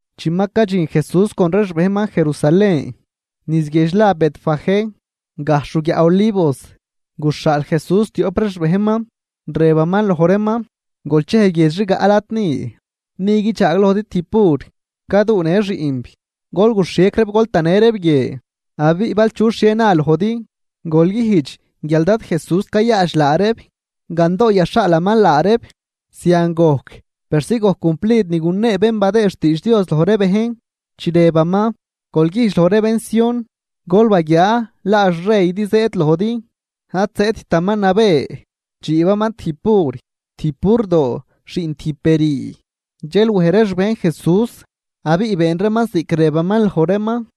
Chi ma cadxin Jesús con ree xbejnman Jerusalén, niz guiedx la Betfagé, gajxh ruguiaꞌ Olivos, guxhaal Jesús tioꞌp ree xbejnman, rëbaman loj reeman: ―Golchej guiedx rigaꞌ lad ni, ni guidxaaglojdi tijb bur, caduunë xiꞌnb. Gol guxhiec reeb gol tanë reeb guie. Abiꞌ bal chu xhie na lojdi, gol güjdx guial Dad Jesús cayaadx laa reeb, gandoo yaxhaalaman laa reeb. Zian gojc persi gojc cumplid ni gunee bén badëë xtiidx Dios loj ree bejn, chi rëbaman: Gol güjdx loj ree bén Sión: “Gol baguiaa laa xreydi zëëd lojdi, ad zëëdtaman nabë, dxiibaman tijb bur, tijb burdoo xiꞌn tijb be rüü.” Dxel wej ree xbejn Jesús abiꞌ been reeman ziꞌc rëbaman loj reeman,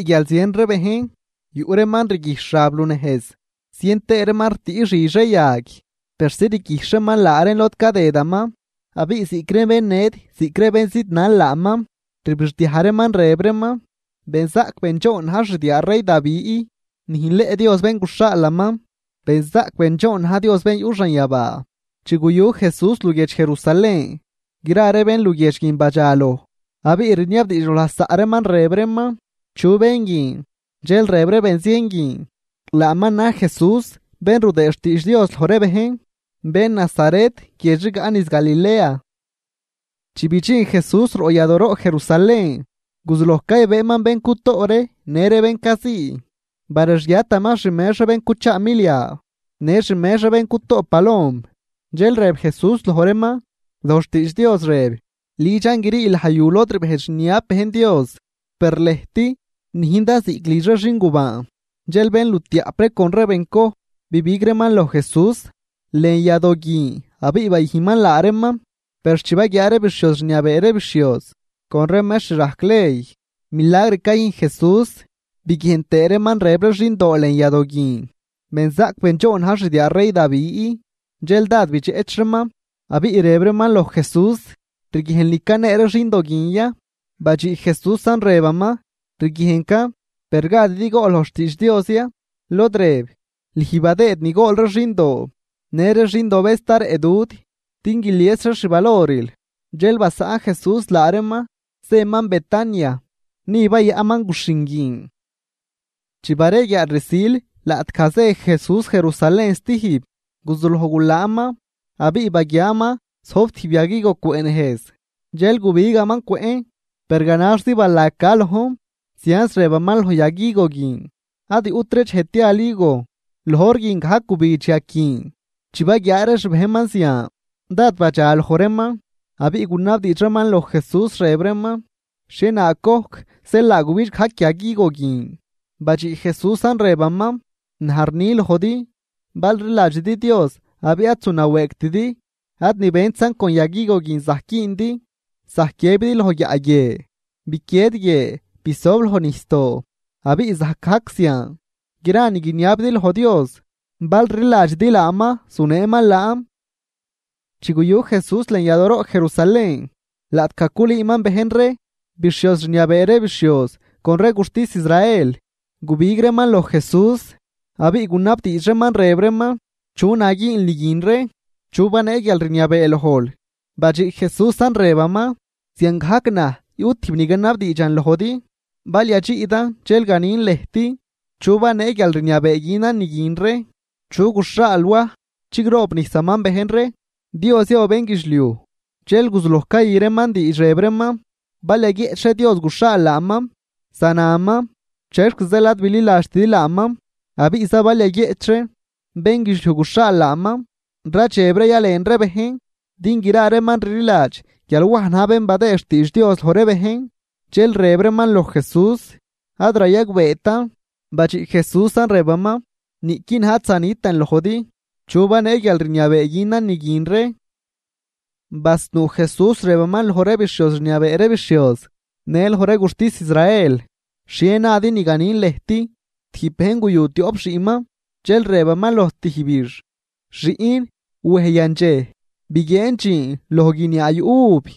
Abiꞌ guial zien ree bejn, yuꞌ reeman rguijxh xab lunejz, zien tëë reeman ritüꞌ xidx ree yag persi rguijxh reeman laa reen lod cadëdaman. Abiꞌ ziꞌc ree bén ned ziꞌc ree bén zidnal laaman, rbixdiaj reeman, rëb reeman: ―¡Benzaꞌc bendxoon na̱j xdiaa rey Davi! ¡Nüjnleꞌ Dios bén guxhaalaman! ¡Benzaꞌc bendxoon na̱j Dios bén yuꞌ xanyabaa! Chi guyu Jesús luguiedx Jerusalén, gra ree bén luguiedx guin badxaloj, abiꞌ riniabdiidx loj lasaꞌ reeman, rëb reeman: ―¿Chu bén guin? Dxel rëb ree benzien guin: ―Laaman na̱j Jesús, bén rudëë xtiidx Dios loj ree bejn, bén Nazaret guiedx rigaꞌ niz Galilea. Chi bidxin Jesús roꞌ yadooroꞌ Jerusalén, guzuloj caybëëman bén cutoꞌ ree në ree bén cazii. Barexguiataman xmex ree bén cuchaa milia në xmex ree bén cutoꞌ palom. Dxel rëb Jesús loj reeman: ―Loj xtiidx Dios rëb: “Lidxan grii laj yu lod rbejdx rniab bejn Dios.” Per lëjt nüjndan ziꞌc lidx ree xingubaan. Dxel bénlutiaꞌp ree con ree bencoj bibig reeman loj Jesús lën yadoo guin abiꞌ bayüjnman laa reeman. Per chi baguiaa ree bixhioz rniabee ree bixhioz con ree mextr rajc ley milagr cayüjn Jesús, biguiejn tëë reeman rëb ree xindoo lën yadoo guin: “Benzaꞌc bendxoon na̱j xdiaa rey Davi”, dxel dád bidxeꞌch reeman. Abiꞌ rëb reeman loj Jesús: ―¿Rguiejnl ni canee ree xindo guin ya? Badxiꞌ Jesúsan, rëbaman: ―Rguiejncan. Per ¿gadidi gool loj xtiidx Dios ya? Lod rëb: Lüj badëëd ni gool ree xindoo në ree xindobëz sta rëꞌ dud, din guilies reex xvaloril. Dxel basaꞌn Jesús laa reeman, zëman Betania ni bayaꞌnman guxhin guin. Chi bareguiaal rsil laꞌtgaj zë Jesús Jerusalén stijb, guzuloj gulaanman. Abiꞌ baguiaaman zojb tijb yag higo cwëꞌ nejz, dxel gubigaman cwëꞌn, per ganaxzi balag ca lojn. Zianz rëbaman loj yag higo guin: ―¡Ad yuꞌtri dxej tial higo! Loj hor guin gajc gubidx yag guin. Chi baguiaa ree xbejnman zian, dád badxaloj reeman abiꞌ gunabdiidx reeman loj Jesús, rëb reeman: ―¿Xhienaag gojc zeel laa gubidx gajc yag higo guin? Badxiꞌ Jesúsan, rëbaman: ―Naj rni lojdi, bal rliladxidi Dios abiꞌ ad zunawëëgtidi, ad ni bentzan con yag higo guin zajc güündi, zajc guiëbidi loj guiaꞌ guie: “Biquied guie, bisob loj nijsdoo”, abiꞌ zajc gajc zian. Gra ni guiniabidi loj Dios, bal rliladxidi laaman, zuneeman laan. Chi guyu Jesús lën yadooroꞌ Jerusalén, laꞌtgaj culüüman bejn ree. Bixhioz rniabee ree bixhioz con ree guxtis Israel, gubig reeman loj Jesús, abiꞌ gunabdiidx reeman, rëb reeman: ―¿Chu na güünl ni guin ree? ¿Chu banee guialrniabee lojl? Badxiꞌ Jesúsan, rëbaman: ―Ziangajc naj yuꞌ tijb ni ganabdiidxan lojdi, bal yadxiꞌdan dxel ganin lëjt chu banee guialrniabee günan ni guin ree. ¿Chu guxhaal Waj chigroobnijsaman bejn ree, Dios ya o bénguidxliuj? Dxel guzuloj cayü reeman diidx, rëb reeman: ―Bal yaguieꞌch ree, “Dios guxhaal laaman”, zanaman: “¿Chexza zeel ad bililadxtidi laaman?” Abiꞌza bal yaguieꞌch ree: “bénguidxliuj guxhaal laaman”, radxeb ree yalen ree bejn din gra reeman rliladx guial Waj na̱j bén badëëd xtiidx Dios loj ree bejn. Dxel rëb reeman loj Jesús: ―Ad rayagbeetan. Badxiꞌ Jesúsan, rëbaman: ―Niꞌqui naj ad zanitan lojdi chu banee guialrniabee günan ni guin ree. Basnuu Jesús rëbaman loj ree bixhioz rniabee ree bixhioz në loj ree guxtis Israel. ―¿Xhie nadi ni ganin lëjt? Tijb bejn guyu tioꞌp xiꞌnman, dxel rëbaman loj tijbix: “Xiꞌn, wej yandxej biguieen dxiin loj guiniaa yuꞌ uv.”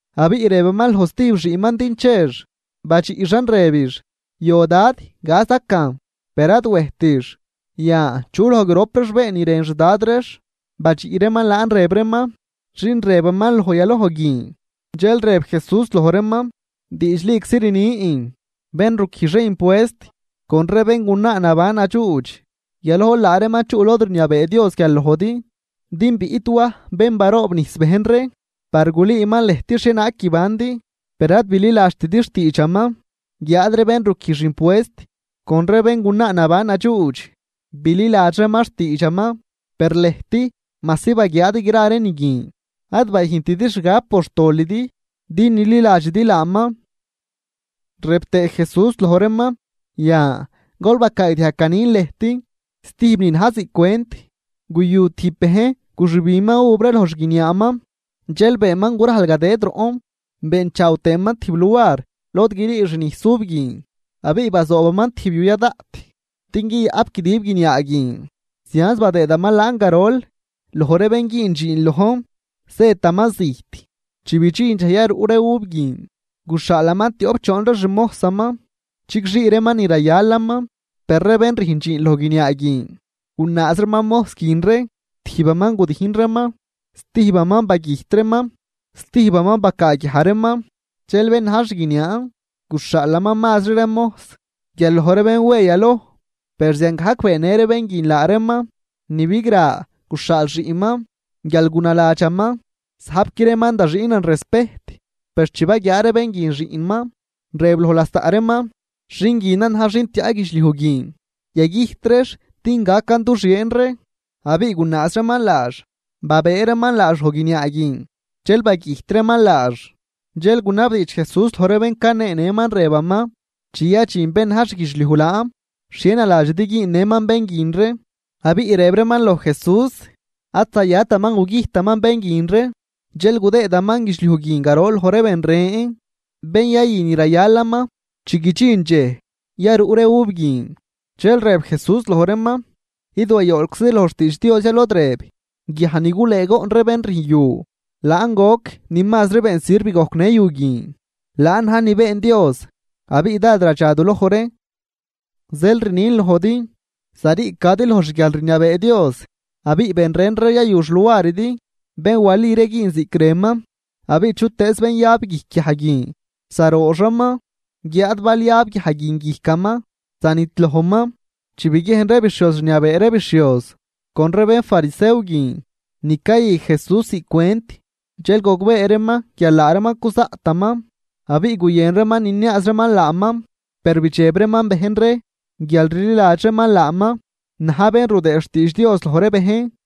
Abiꞌ rëbaman loj stijb xiꞌnman din chex, badxiꞌxan, rëbix: “Yo dad, gazacan.” Per ad wejtix. Yan, ¿chu loj grop reex been ni rën xdad reex? Badxiꞌ reeman laan, rëb reeman: ―Xin rëbaman loj yaloj guin. Dxel rëb Jesús loj reeman: ―Diidxliczi rnin, bén ruquijx ree impuest con ree béngunaa naban nadxuudx, yalojl laa reeman chuꞌ lod rniabee Dios guial lojdi. Din biꞌt Waj, bén baroobnijs bejn ree par gulüüman lëjt xhienaag guibandi, per ad bililadxtidi xtiidxaman. Guiáad ree bén ruquijx impuest con ree béngunaa naban nadxuudx, bililadx reeman xtiidxaman. Per lëjt majsi baguiaadi gra ree ni guin, ad bayüjntidi xgab por xtolidi din nililadxidi laaman. Rëb tëë Jesús loj reeman: ―Yan, gol bacaagdiajg ganin lëjt stijb ni na̱j ziꞌc cwent. Guyu tijb bejn guxübinman uv ree loj xguiniaaman, dxel beenman gurajl gadëd roꞌn, beenchaaw tëëman tijb luar lod grii xnijs uv guin, abiꞌ bazoobaman tijb yu ya daꞌt din guiyaꞌp guidib guiniaa guin. ’Zianz badëëdaman laan garol loj ree bén güün dxiin lojn, zëtaman zijt. Chi bidxin dxej yaruꞌ ree uv guin, guxhaalaman tioꞌp choon ree xmojsaman chigxii reeman ni rayalaman. Per ree bén rüjn dxiin loj guiniaa guin gunaaz reeman mojs guin ree. Tijbaman gudijn reeman, stijbaman bagüjt reeman, stijbaman bacaaguiaj reeman. Dxel bén na̱j xguiniaan guxhaalaman mazri ree mojs guial loj ree bén we yaloj, per ziangajc beennë ree bén guin laa reeman. ’Ni bigra, guxhaal xiꞌnman guial gunaladxaman: “Zajpqui reeman da xiꞌnan respejt.” Per chi baguiaa ree bén guin xiꞌnman, rëb loj lasaꞌ reeman: “Xin guinan na̱j xin tiaꞌ guidxliuj guin, yagüjt reex din gacan du xieen ree.” Abiꞌ gunaaz reeman laax, babëë reeman laax loj guiniaa guin dxel bagüjt reeman laax. Dxel gunabdiidx Jesús loj ree bén caneenëman, rëbaman: ―Chi yadxin bén na̱j xguidxliuj laan, ¿xhie naladxidi güünnëman bén guin ree? Abiꞌ rëb reeman loj Jesús: ―Ad zayataman gugüjtaman bén guin ree, dxel gudëëman guidxliuj guin garol loj ree ben ren, bén yayü ni rayalaman chi guidxin dxej yaruꞌ ree uv guin. Dxel rëb Jesús loj reeman: ―¿Id wayolczidi loj xtiidx Dios ya? Lod rëb: Guiaj ni gulëëgoꞌn ree bén rüjn yu. Laan goc ni mazri been sirv gojcnë yu guin. Laan na̱j ni been Dios, abiꞌ dád radxa du loj ree. Zeel rnin lojdi, zariicadi loj xguialrniabee Dios abiꞌ ben ren ree yayu xluaridi, bén wali ree güün ziꞌc rënman. Abiꞌ chutëëz bén yab guijc guiaj guin, zarooxaman, guiáad bal yab guiaj guin guijcaman zanidlojman. Chi biguiejn ree bixhioz rniabee ree bixhioz con ree bénfarisew guin ni cayü Jesús ziꞌc cwent, dxel gogbee reeman guial laa reeman cuzaꞌtaman. Abiꞌ guyën reeman niniaaz reeman laaman, per bidxeb reeman bejn ree guial rliladx reeman laaman na̱j bén rudëëd xtiidx Dios loj ree bejn.